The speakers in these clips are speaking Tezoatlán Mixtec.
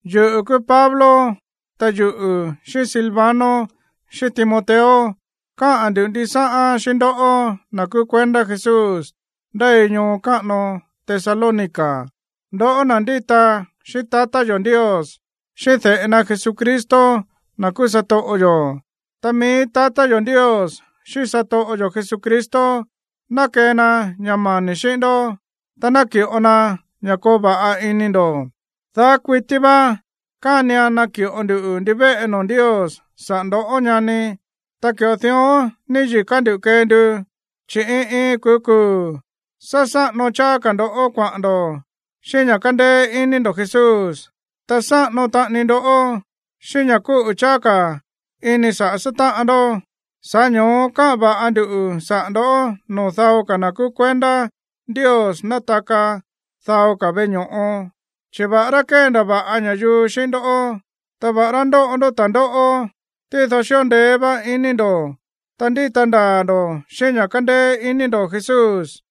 Yuꞌu̱ kúú Pablo, ta yuꞌu̱ xíꞌín Silvano xíꞌín Timoteo káꞌa̱n ndu̱ ndisáꞌán xíꞌín ndoꞌó, na̱ kúú kuendá Jesús ndéi ñoo káꞌano Tesalónica, ndoꞌó na̱ ndíta xíꞌín tatá yo̱ Ndios, xíꞌín de̱ꞌe na Jesucristo, na̱ kúú satoꞌo yo̱. Ta mií tatá yo̱ Ndios xíꞌín satoꞌo yo̱ Jesucristo ná kee na ña̱ mani̱ xíꞌín ndó, ta naki̱ꞌo na ña̱ koo va̱ꞌa ini ndo̱. Daá kuití vá kánian naki̱ꞌo nduꞌu̱ ndivéꞌe noo̱ Ndios saꞌa̱ ndo̱, ñani. Ta ki̱ꞌo dión níyi̱ká ndú kee ndu, chi̱ iin iin kuu̱ kuu̱ sá sáꞌano cháá ka̱ ndo̱ kuaꞌa̱n ndo̱ xíꞌín ña̱ kándéé iní ndo̱ Jesús, ta sáꞌano taꞌani ndó xíꞌín ña̱ kúꞌu̱ cháá ka̱ ini saꞌa̱ sátáꞌan ndó. Sa̱ꞌá ño̱ó káꞌa̱n va̱ꞌa ndu saꞌa̱ ndo̱ꞌó noo̱ dao ka̱ na̱ kúú kuendá Ndios nátaka dao ka̱ veꞌe ño̱ꞌo, chi̱ va̱ꞌará kéndava̱ꞌa ña̱yuu xíꞌín ndó, ta va̱ꞌará ndóꞌo ndó ta̱ndóꞌó, tído xíꞌo ndeé vá iní ndo̱, ta ndíta ndaa̱ ndo̱ xíꞌín ña̱ kándéé iní ndo̱ Jesús.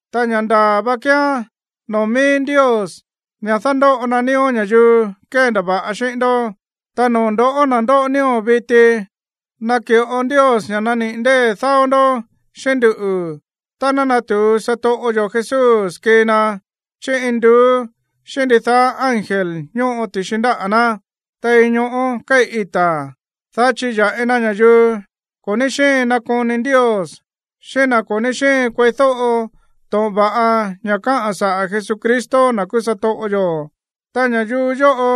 Ta ña̱ ndaa̱ vá kíán noo̱ mií Ndios ña̱ dándóꞌo na nío̱ ña̱yuu kéndava̱ꞌa xíꞌín ndoꞌó. Ta noo̱ ndo̱ꞌó, na̱ ndóꞌo nío̱ viti, naki̱ꞌo Ndios ña̱ naniꞌi̱ ndée̱ dáó ndoꞌó xíꞌín nduꞌu̱ tá ná natu̱u satoꞌo yo̱ Jesús kii na chí induú xíꞌín ndidaá ángel ñóꞌo ti̱xi ndáꞌa̱ ná tein ñoꞌó kéi̱ ita̱, dá chiya̱ꞌi na ña̱yuu ko̱ ní xíin nakoni Ndios, xíꞌín na̱ ko̱ ní xíin kueídóꞌo to̱ꞌon va̱ꞌa ña̱ káꞌa̱n saꞌa̱ Jesucristo, na̱ kúú satoꞌo yo̱. Ta ña̱yuu yóꞌo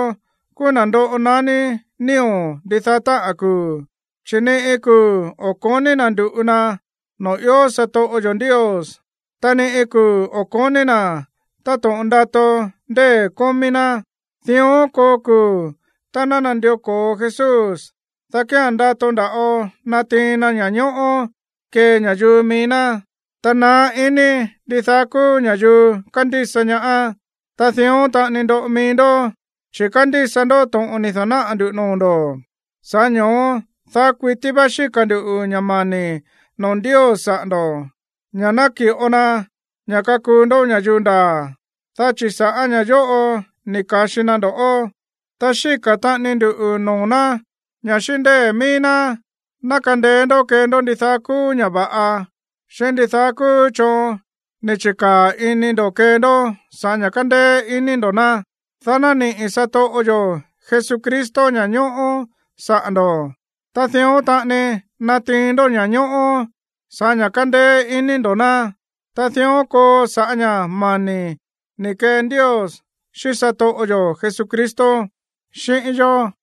kúú na̱ ndoꞌo naní nío̱ ndidaá táꞌa̱n kuu̱, chi̱ ni iin kuu̱ o̱ ko̱ní na̱ ndu̱ꞌu na noo̱ ió satoꞌo yo̱ Ndios, ta ni iin kuu̱ o̱ ko̱ní na̱ táto̱ꞌon ndato ndée̱ kómí ná. Dión koo kuu̱ tá ná nandió ko̱o Jesús, dá kía̱n ndato nda̱ꞌo natiin na ña̱ñóꞌó kee ña̱yuu mií ná, ta naá iní ndidaá kúú ña̱yuu kándísa ñaá. Ta dión taꞌani ndoꞌo mií ndó, chi̱ kándísa ndó to̱ꞌon ni̱ da̱náꞌa̱ ndu̱ noo̱ ndo̱. Sa̱ꞌá ño̱ó daá kuití vá xíka̱ ndu̱ ña̱ mani̱ noo̱ Ndios saꞌa̱ ndo̱, ña̱ ná ki̱ꞌo na ña̱ kakuu ndó ña̱yuu ndaa̱, dá chi̱ sa̱ꞌá ña̱ yóꞌo ni̱ ka̱xi na ndo̱ꞌó. Ta xíka̱ taꞌani ndu noo̱ ná ña̱ xíꞌín ndée̱ mií ná ná kandeé ndó kee ndó ndidaá kúú ña̱ va̱ꞌa, xíꞌín ndidaá kúú choon ni̱ chi̱káa̱ ini ndo̱ kee ndó sa̱ꞌá ña̱ kándéé iní ndo̱ ná, dá ná niꞌi̱ satoꞌo yo̱ Jesucristo ña̱ñóꞌó saꞌa̱ ndo̱. Ta dión taꞌani natiin ndó ña̱ñóꞌó sa̱ꞌá ña̱ kándéé iní ndo̱ ná, ta dión koo sa̱ꞌá ña̱ mani̱ ni̱ kee Ndios xíꞌín satoꞌo yo̱ Jesucristo xíꞌín yó.